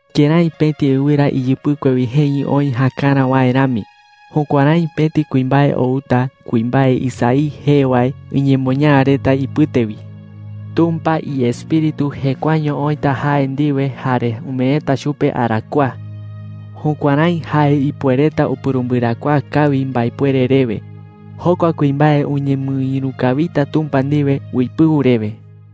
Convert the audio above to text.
Kërái pëti ɨwɨra iyɨpɨkue wi jeñɨ oï jäkarä wae rami, jukuärái pëti kuimbae outa kuimbae Isaí jee wae iñemoñaa reta ipɨte wi. Tumpa iEspíritu jekuaeño oïta jae ndiwe jare umeeta chupe arakuaa. Jukuärái jae ipuereta upurumbɨarakuaa kawi mbaepuere rewe. Jokua kuimbae uñemɨïru kawita Tumpa ndiwe uipɨu rewe.